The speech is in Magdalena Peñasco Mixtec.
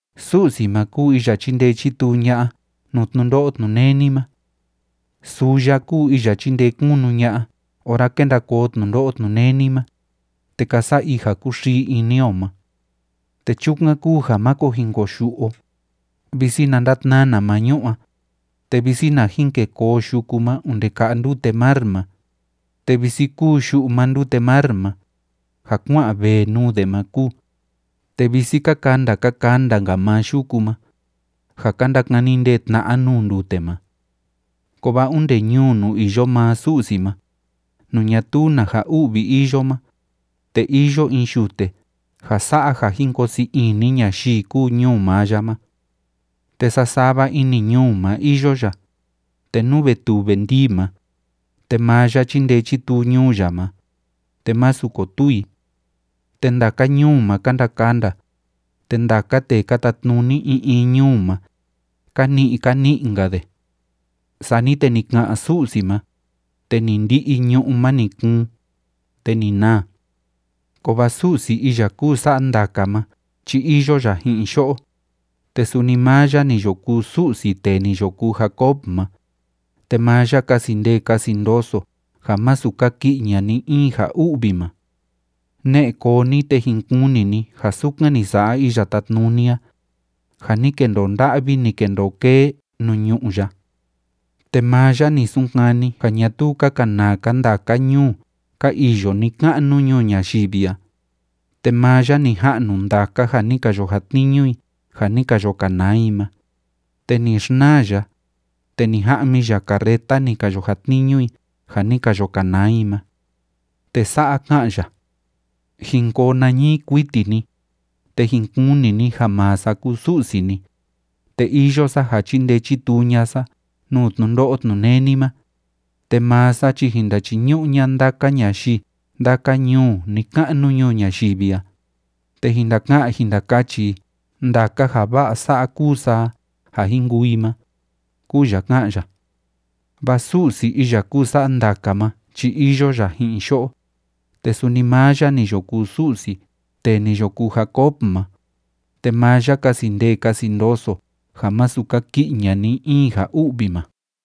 Su'si ma kúu iya chíndee chítuu ña'a nuu tnundo'o tnuneni ma. Suu ya kúu iya chíndee kunu ña'a ora kénda koo tnundo'o tnuneni ma, te ka sa'a i ja kúxii ini o ma. Te chukan kúu ja máko jin koyu'u o, visi na ndatnana maa ñu'ú a, te visi na jin kê koo yuku ma onde ka'a ndute mar ma, te visi kúu yu'u maa ndute mar ma, ja kuá'an vee nuu de ma kúu, te visi ka kanda ka kanda‑nka maa yuku ma, ja ka ndakani ndee tna'a nuu ndute ma. Kovaa onde ñuu nuu iyo maa Su'si ma, nuu ñatuu na ja u'vi iyo ma, te iyo in yute ja sa'a ja jin koo sii ini ñayii kúu ñuu maa ya ma. Te sasava ini ñuu ma iyo ya, te nú ve tuu ve ndii ma, te maa ya chindee chituu ñuu ya ma, te masu kotuu i. Te ndaka ñuu ma ka ndakanda, te ndaka tee ka tatnuni in in ñuu ma, ka ni'i ka ni'i‑nka de. Sani te ni ka'an Su'si ma, te ni ndi'i ñu'ú ma ni kuun, te ni naa. Kovaa Su'si iya kúu sa'a ndaka ma chi iyo ya ji'in yo'o, te suni maa ya ni yo kuu Su'si tee ni yo kuu Jacob ma, te maa ya kasi ndee kasi ndoso ja masu kaki'i ña'a ni‑in ja u'vi ma. Ne'e koo ni, te jin kuni ni ja sukan ni sa'a Iya Tátnuni a, ja ni kendoo nda'vi, ni kendoo kee nuu ñu'ú ya. Te maa ya ni sunkani ja ñatuu ka kanaa‑ka ndaka ñuu ka iyo ni‑ka'nu ñuu ñayivi a, te maa ya ni ja'nu ndaka ja ni ka yo jatniñu i ja ni ka yo kanaa i ma, te ni xnaa ya, te ni ja'mi ya carreta ni ka yo jatniñu i ja ni ka yo kanaa i ma. Te sa'a ká'an ya: “Jin ko nañii kuiti ni, te jin kuni ni ja maa sa kúu Su'si ni, te iyo sa ja chindee chituu ña'a sa nuu tnundo'o tnuneni ma, te maa sa chi jin ndachiñu'u ña'a ndaka ñayii ndaka ñuu ni‑ka'nu ñuu ñayivi a, te jin ndaka'an jin ndakachi i ndaka ja va'a sa'a kúu sa a ja jin kuu i ma”, kúu ya ká'an ya. Vaa Su'si iya kúu sa'a ndaka ma chi iyo ya ji'in yo'o, te suni maa ya ni yo kuu Su'si tee ni yo kuu Jacob ma, te maa ya kasi ndee kasi ndoso ja masu kaki'i ña'a ni‑in ja u'vi ma.